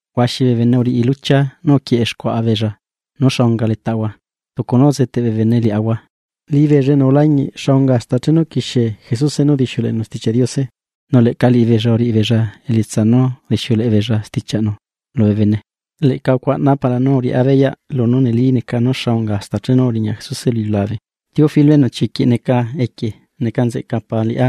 Huaxi bee bene uriꞌi luchia nú uquieꞌe xcuaꞌa beella nú xa unga letaꞌahua, tucu nú uzeꞌteꞌ bee bene liaꞌahua, liꞌibeella enu ulañiꞌ xa unga hasta chenu uquixie Jesuse nú udixiuleꞌenu Stichiaꞌ Diose, nu leꞌca liꞌibeella uriꞌi beella elietsa nú udixieleꞌe beella stichiaꞌnu lubee bene. Leꞌca ucuaꞌnaa para nú uriꞌá beyaꞌ lunú neli neca nú xa unga hasta chenu uriña Jesuse lu iliulabe. Teófilo enu chiquiꞌ neca equie neca nzeꞌca para liꞌá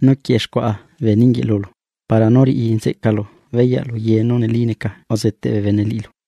nú quieꞌe xcuaꞌa bee ninguieꞌ lulu, para nú riꞌi nzeꞌcalu beyaꞌ lu ye nú neli neca uzeteꞌ bee bene liꞌilu.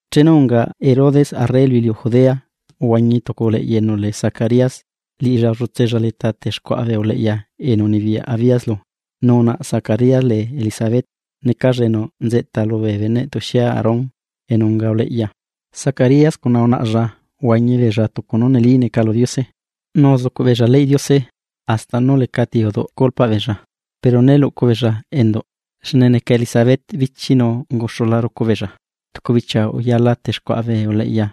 Chenu unga Herodes arre lu iliu Judea, uhuañi tucu uleꞌya enu lee Zacarías, liꞌilla ullutsella leta texcuaꞌa bee uleꞌya enu unibiyaꞌ Abías lu, nu unaꞌa Zacarías lee Elisabet, necalla enu nzeꞌta lubee beneꞌ tuxie Aarón enu unga uleꞌya. Zacarías cuna unaꞌlla uhuañi beella tucu nú neli neca lu Diose, nu uzucuꞌ beella leyꞌ Diose, hasta nú lecati uduꞌ culpaꞌ beella. Pero né luꞌcu beella enduꞌ, xne neca Elisabet bíchi nu unguxula rucu beella. Tucu bichia uyala texcuaꞌa bee uleꞌya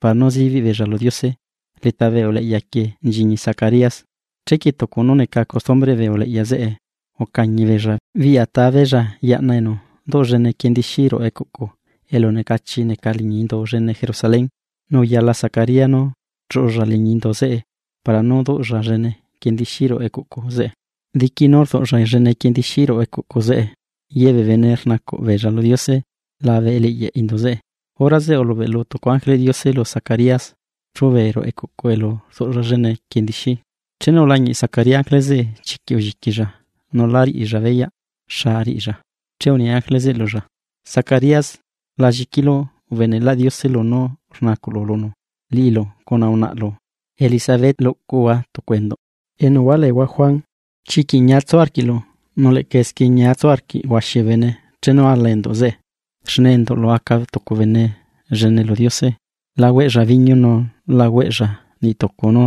para nú zibiꞌ beella lu Diose, leta bee uleꞌya quieꞌ nchiñi Zacarías. Chequie tucu nú neca costumbreꞌ bee uleꞌya zeꞌe, ucañi beella biꞌya ta beella yaꞌna enu duꞌ llene quiendixí ruꞌu ecuꞌcu elu necachi neca liñi indu llene Jerusalén, nu uyala Zacarías nú chuꞌulla liñi indu zeꞌe para nú duꞌlla llene quiendixí ruꞌu ecuꞌcu zeꞌe. Diqui nú rduꞌlla llene quiendixí ruꞌu ecuꞌcu zeꞌe, ye bee bene rnacuꞌ beella lu Diose labe eliꞌyaꞌ indu zeꞌe. Hora zeꞌe ulubeꞌlu tucu ángeleꞌ Diose lu Zacarías, chúbee ruꞌu ecuꞌcu elu rduꞌlla llene quiendixí. Chenu ulañiꞌ Zacarías ángele zeꞌe, chiquiꞌ ulliquilla nu lá riꞌilla beyaꞌ xa riꞌilla. Che uni ángele zeꞌe lulla: ―Zacarías, la lliquilu, ubeneꞌlaꞌ Diose lunú rnacuꞌlu lunu, liꞌilu cuna unaꞌalu Elisabet luꞌcuhua tucu enduꞌ, enu hualeehua Juan. Chiquiꞌ ñia tsu arquiꞌlu, nu leꞌca esquie ñia tsu arquiꞌ huaxi bee bene chenu ala enduꞌ zeꞌe. Xne enduꞌlu aca tucu bene llene lu Diose. La hueꞌlla biñu nu la hueꞌlla niꞌ tucu nú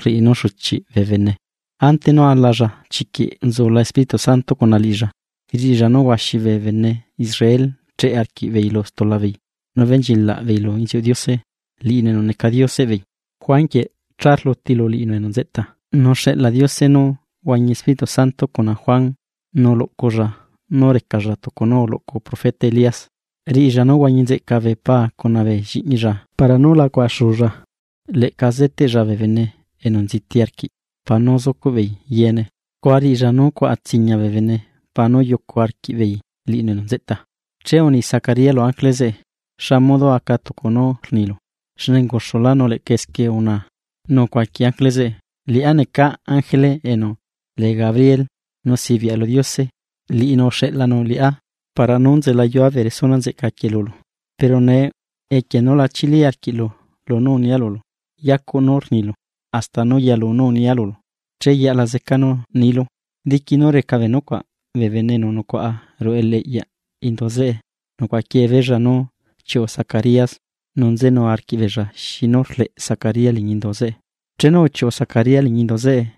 rriꞌi nú xuchiꞌ bee bene. Ante nú alalla chiquiꞌ nzula Espíritu Santo cuna liꞌilla. Riꞌilla nu huaxi bee bene Israel cheꞌe arquiꞌbeei lu stula beei nú benchilaꞌ beei lu inziuꞌ Diose, liꞌinu enu neca Dioseꞌ beei. Juan quieꞌ cha rluti lu liꞌinu enu nzeꞌta, nu xeꞌla Diose nú huañi Espíritu Santo cuna Juan nu luꞌculla nú recalla tucu nú uluꞌcu profeta Elías, riꞌilla nú huañi nzeꞌca bee paa cuna bee lliꞌñilla para nú la cuaꞌa xuulla. Leꞌca zeteꞌlla bee bene enu nziti arquiꞌ para nú zucuꞌ beei yeene, scua riꞌilla nú cuaꞌa tsiña bee bene para nú yucu arquiꞌbeei liꞌinu enu nzeꞌta. Che uni Zacarías lu ángele zeꞌe: ―¿Xa modo aca tucu nú rnilu? Xne unguxulá nu leꞌca esquie unaa. Nu ucuaqui ángele zeꞌe: ―Liꞌá neca ángele enu lee Gabriel, nu sibiaꞌa lu Diose, liꞌinu uxeꞌlanu liꞌá para nú nzelayua bee resuna nzeꞌca quieꞌ lulu. Pero nee, equie nú la chili arquiꞌlu lunú unia lulu, yacuꞌ nú rnilu, hasta nú yalu nú unia lulu, che yaꞌla zeca nú nilu. Diqui nú reca bee nucuaꞌ, bee bene enu nucuaꞌa ruꞌu eliꞌyaꞌ indu zeꞌe nucuaꞌa quiee beella nú chiuꞌu Zacarías nu nzenu arquiꞌbeella xi nú rleꞌ Zacarías liñi indu zeꞌe. Chenu uchiuꞌu Zacarías liñi indu zeꞌe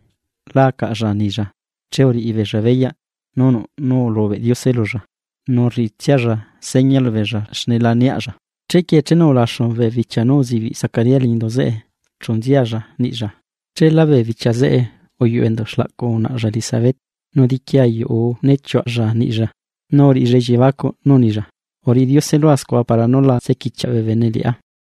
la acaꞌlla nilla, che uriꞌi beella beyaꞌ nú nuꞌ nú ulubeꞌ Diose lulla, nu rriꞌitsialla seña lubeella xne la niaꞌlla. Chequie chenu ulaxu bee bichia nú uzibiꞌ Zacarías liñi indu zeꞌe chu nzialla niꞌilla. Cheela bee bichia zeꞌe, uyuꞌu enduꞌ xlaꞌcu unaꞌalla Elisabet, nu diqui ayuꞌ uu né chiuaꞌalla niꞌlla, nu uriꞌilla elliebacuꞌ nú unilla: “Uriꞌi Diose lua scua, para nú la tsequichiaꞌ bee bene liꞌá.”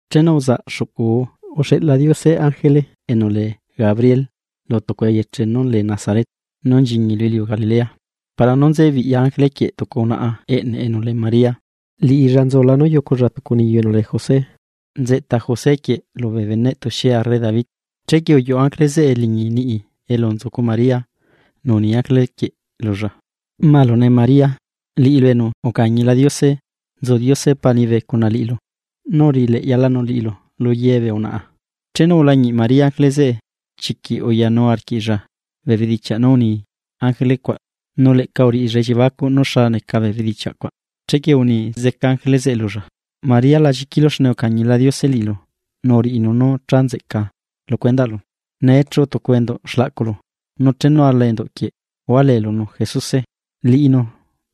Chenu uzaꞌ xuꞌcu uu, uxeꞌla Diose ángele enu lee Gabriel lu tucu eyeche nú lee Nazaret nú nchiñi lu iliu Galilea. Para nú nze biꞌya ángele quieꞌ tucu unaꞌa eꞌne enu lee María, liꞌilla nzula nú yuculla tucu niyu enu lee José, nzeꞌta José quieꞌ lubee beneꞌ tuxie arre David. Chequie uyuꞌu ángele zeꞌe liñi niꞌi elu nzucu María nu uni ángele quieꞌ lulla: ―¡Malune María, liꞌilu enu ucañila Diose! Nzu Diose Paa liñibe cuna liꞌilu, nu uriꞌi leꞌyalanu liꞌilu lu ye bee unaꞌa. Chenu ulañiꞌ María ángele zeꞌe, chiquiꞌ uyanu arquiꞌlla bee bedichiaꞌ nú uni ángele cuaꞌ, nu leꞌca uriꞌilla elliebacuꞌ nú xa neca bee bedichiaꞌ cuaꞌ. Chequie uni zeca ángele zeꞌe lulla: ―María, la lliquilu, xne ucañila Diose liꞌilu nu uriꞌinu nú cha nzeꞌca lu cuendaꞌlu. Nee chuꞌu tucu enduꞌ xlaꞌculu, nu chenu ala enduꞌ quieꞌ hualeelunu Jesuse. Liꞌinu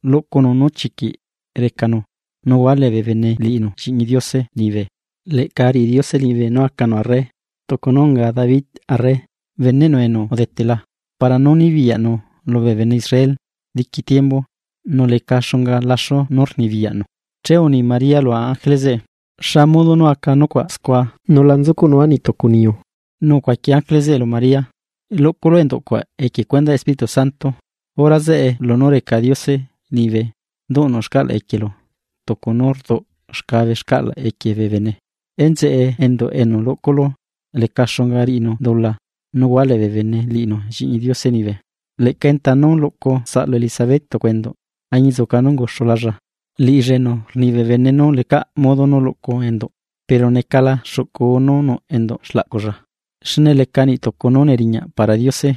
luꞌcunu nú chiquiꞌ recanu, nu hualee bee bene liꞌinu Lliꞌñi Diose liñibe, leꞌca riꞌi Diose liñibe nú acanu arre, tucu nú unga David arre, beneꞌnu enu udetela, para nú nibiyaꞌnu lubee bene Israel diqui tiembu. Nu leca xunga laxu nú rnibiyaꞌnu. Che uni María lu ángele zeꞌe: ―¿Xa modo nú aca nucuaꞌ scua, nu la nzucuꞌnua niꞌ tucu niyu? Nu ucuaqui ángele zeꞌe lu María: ―Luꞌculu enduꞌ cuaꞌ equie cuendaꞌ Espíritu Santo, hora zeꞌe lunú reca Diose liñibe duꞌnu xcaꞌlaꞌ equielu tucu nú rduꞌ xcabe xcaꞌlaꞌ equie bee bene. Enzeꞌe enduꞌ enu luꞌculu leca xunga riꞌinu dula nu hualee bee bene liꞌinu Lliꞌñi Diose liñibe. Leꞌca enta nú luꞌcu saꞌlu Elisabet tucu enduꞌ, añinzuca nú unguxulalla, liꞌilla enu rni bee bene nú lecaꞌ modo nú luꞌcu enduꞌ pero necala xuꞌcu uu nú nuꞌ enduꞌ xlaꞌculla. Xne leca niꞌ tucu nú neriñaꞌ para Diose.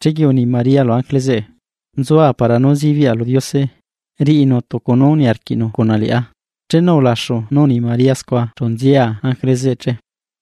Chequie uni María lu ángele zeꞌe: ―Nzua para nú zibiaꞌa lu Diose, riꞌinu tucu nú niarquiꞌnu cuna liꞌá. Chenu ulaxu nú uni María scua, chu nzia ángele zeꞌe che.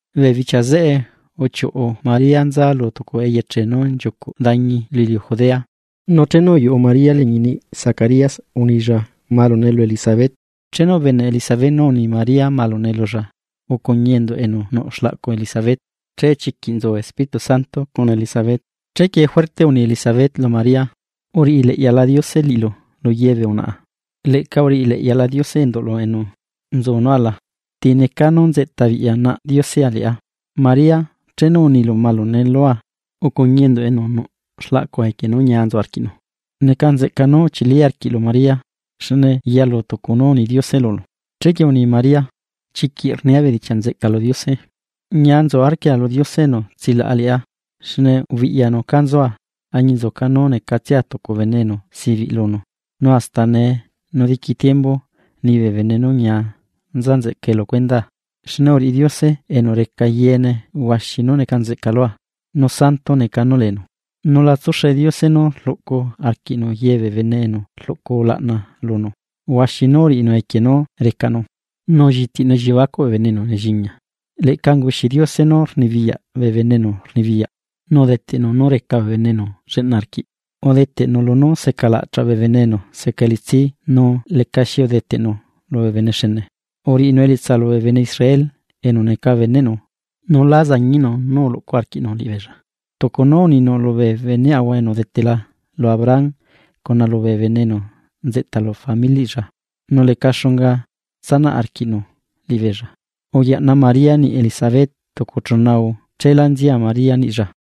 Bee bichia zeꞌe, uchiuꞌu María nza lu tucu eyeche nú nchiucuꞌ dañi lu iliu Judea, nu chenu uyuꞌu María liñi niꞌ Zacarías unilla malune lu Elisabet. Chenu ubeneꞌ Elisabet nú uni María malune lulla, ucuñi enduꞌ enu nuꞌ xlaꞌcu Elisabet, scua chiquiꞌ uyaꞌna Espíritu Santo cuna Elisabet. Chequie, juerte uni Elisabet lu María: ―¡Uriꞌi leꞌyala Diose liꞌilu lu ye bee unaꞌa, leꞌca uriꞌi leꞌyala Diose enduꞌlu enu nzu nú ala! ¿Ti necaa nú nzeꞌta biꞌya naꞌ Diosea liꞌá? María chenu unilu malune lua, ucuñi enduꞌ enu nuꞌ xlaꞌcua equie nú ñia nzu arquiꞌnu. ¡Neca nzeꞌca nú uchili arquiꞌlu María, xne yalu tucu nú uni Diose lulu! Chequie uni María: Chiquiꞌ rnia bedichiaꞌ nzeꞌca lu Diose. Ñia nzu arquia lu Diose enu tsilaꞌa liꞌá. Xne ubiꞌyanu caa nzua, añinzuca nú necatsia tucu bene enu sibiꞌ lunu, nu hasta nee nu diqui tiembu ni bee bene nú ñia nza nzeꞌcae lu cuendaa. Xne uriꞌi Diose enu reca yeene huaxi nú neca nzeꞌca lua. ¡Nu Santo neca nú leenu! Nu la tsuxe Diose nú rluꞌcu arquiꞌnu ye bee bene enu rluꞌcu ulaꞌna lunu. Huaxi nú uriꞌinu equie nú recanu. Nu ullitiꞌnu elliebacuꞌ bee bene enu nelliña. Leꞌca unguxi Diose nú rnibiyaꞌ bee bene enu rnibiyaꞌ, nu udeteꞌnu nú reca bee bene enu lleꞌna arquiꞌ. Udeteꞌnu lunú secalaꞌchaꞌ bee bene enu seca elitsi nu lecaxi udeteꞌnu lubee bene xene. Uriꞌinu elietsa lubee bene Israel, enu neca beneꞌnu, nu lá zañiꞌnu nú uluꞌcu arquiꞌnu liꞌibeella. Tucu nú uninu lubee beneaꞌhua enu udetela lu Abraham cuna lubee bene enu nzeꞌta lu Familiꞌlla. Nu leca xunga tsanaꞌ arquiꞌnu liꞌibeella. Uyaꞌna María niꞌi Elisabet tucu chuna uu, cheela nzia María niꞌlla.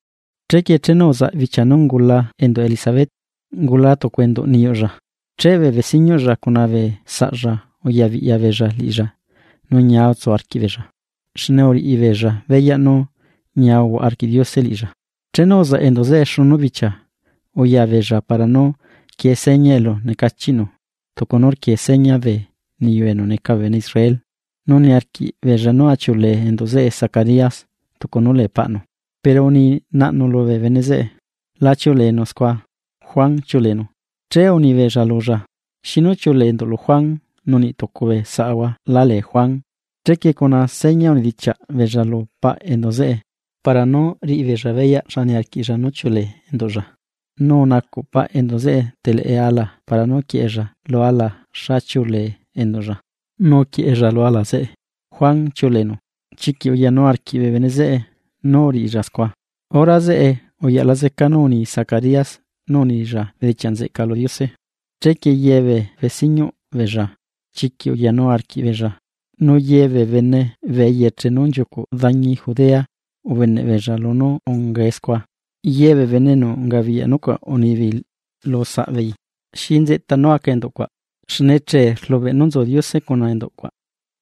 Chequie chenu uzaꞌ bichia nú ungula enduꞌ Elisabet, ungula tucu enduꞌ niyuꞌlla. Che bee besiñuꞌlla cuna bee saꞌlla uya biꞌya beella liꞌilla nu ñia utsu arquiꞌbeella, xne uriꞌi beella beyaꞌ nú ñia uhuaꞌa arquiꞌ Diose liꞌilla. Chenu uzaꞌ enduꞌ zeꞌe xunu bichia, uya beella para nú quie seña elu necachiꞌnu, tucu nú rquie seña bee niyu enu neca bee bene Israel. Nu niarquiꞌ beella nú achiuꞌulee endu zeꞌe Zacarías tucu nú lee paꞌnu. Pero uni naꞌnu lubee bene zeꞌe: ―La chiuꞌuleenu scua. Juan chiuꞌuleenu. Che uni beella lulla: ―¿Xinú chiulee enduꞌlu Juan nu niꞌ tucu bee saꞌhua la lee Juan? Chequie cuna seña unidichiaꞌ beella lu paꞌ enduꞌ zeꞌe, para nú riꞌi beella beyaꞌ xa niarquiꞌlla nú chiuꞌlee enduꞌlla. Nu unacuꞌ paꞌ enduꞌ zeꞌe teleꞌe ala para nú quieꞌella lu ala xa chiuꞌulee enduꞌlla, nu uquieꞌella lu ala zeꞌe: “Juan chiuꞌleenu.” Chiquiꞌ uyanu arquiꞌ bee bene zeꞌe nú uriꞌilla scua. Hora zeꞌe uyaꞌla zeca nú uni Zacarías, nu unilla bedichiaꞌ nzeꞌca lu Diose. Chequie ye bee besiñuꞌ beella chiquiꞌ uyanu arquiꞌbeella, nu ye bee bene bee eyeche nú nchiucu dañi Judea ubeneꞌ beella lunú ungae scua. Ye bee bene enu ungabiyaꞌ nucuaꞌ unibeei lu saꞌbeei: ―¿Xi nzeꞌta nú aca enduꞌ cuaꞌ? Xne che rlubeꞌ nú nzu Diose cuna enduꞌ cuaꞌ.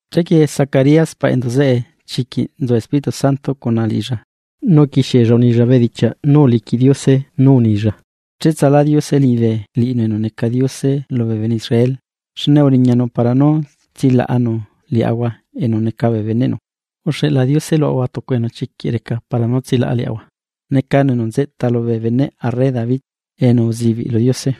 Chequie Zacarías paꞌ enduꞌ zeꞌe, chiquiꞌ nzu Espíritu Santo cuna liꞌilla, nu uquixiella unilla bedichiaꞌ nú uliquiꞌ Diose nú unilla: ¡Cheꞌtsalá Diose liñibe liꞌinu enu neca Diose lubee bene Israel, xne uriñanu para nú tsilaꞌanu liaꞌahua enu neca bee beneꞌnu! Uxeꞌla Diose luꞌahua tucu enu chiquiꞌ reca para nú tsilaꞌa liaꞌahua, necanu enu nzeꞌta lubee beneꞌ arre David enu uzibiꞌ lu Diose.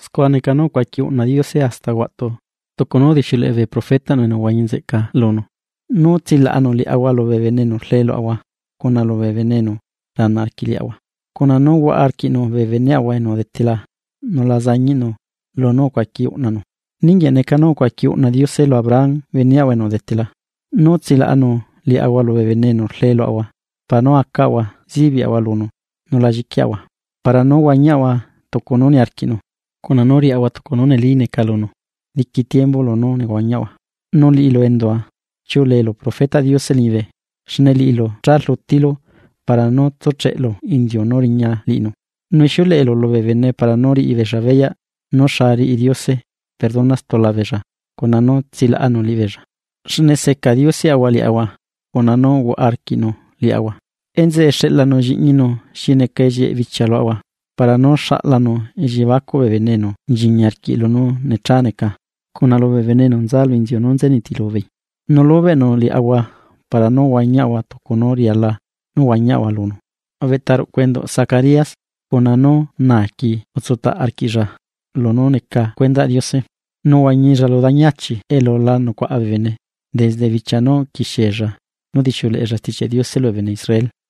Scua neca nú ucuaqui uꞌna Diose hasta huaꞌtu tucu nú udixiuleꞌe bee profetaꞌnu enu uhuañi nzeꞌca lunu: Nu tsilaꞌanu liaꞌahua lubee bene enu rlee luaꞌahua cuna lubee bene enu rana arquiꞌ liaꞌahua, cuna nú huaꞌa arquiꞌnu bee beneꞌahua enu udetela nu la zañiꞌnu lunú ucuaqui uꞌnanu. Ninguieꞌ neca nú ucuaqui uꞌna Diose lu Abraham beneꞌahua enu udetela: Nú tsilaꞌanu liaꞌhua lubee bene enu rlee luaꞌahua, para nú acaꞌahua zibiaꞌahua lunu nu la lliquiaꞌahua, para nú huañiaꞌahua tucu nú niarquiꞌnu, cuna nú riaꞌahua tucu nú neli neca lunu, diqui tiembu lunú nehuañiaꞌahua. Nu liꞌilu endua, chiuꞌuleelu profetaꞌ Diose liñibe, xne liꞌilu cha rlutilu, para nú tsúcheꞌlu inziu nú riña liꞌinu. Nu ixiuleꞌelu lubee bene para nú riꞌi beella beyaꞌ nú xa riꞌi Diose perdona stula beella cuna nú tsilaꞌanu liꞌibeella. Xne seca Dioseꞌahua liaꞌahua cuna nú uhuaꞌa arquiꞌnu liaꞌahua, enzeꞌe xeꞌlanu Lliꞌñinu xi neca ellieꞌ bichia luaꞌahua, para nú xaꞌlanu elliebacuꞌ bee bene enu nchiñi arquiꞌ lunú necha neca, cuna lubee bene enu nza lu inziu nú nze nitilu beei, nu lubeꞌnu liaꞌahua para nú huañiaꞌahua tucu nú riala nú huañiaꞌhua lunu. Ubeꞌtaruꞌcu enduꞌ Zacarías cuna nú naaqui utsutaꞌ arquiꞌlla lunú neca cuendaꞌ Diose, nu uhuañilla lu dañi achi elu la nucuaꞌa bene, desde bichia nú uquixiella nú udixiuleꞌella Stichiaꞌ Diose lubee bene Israel.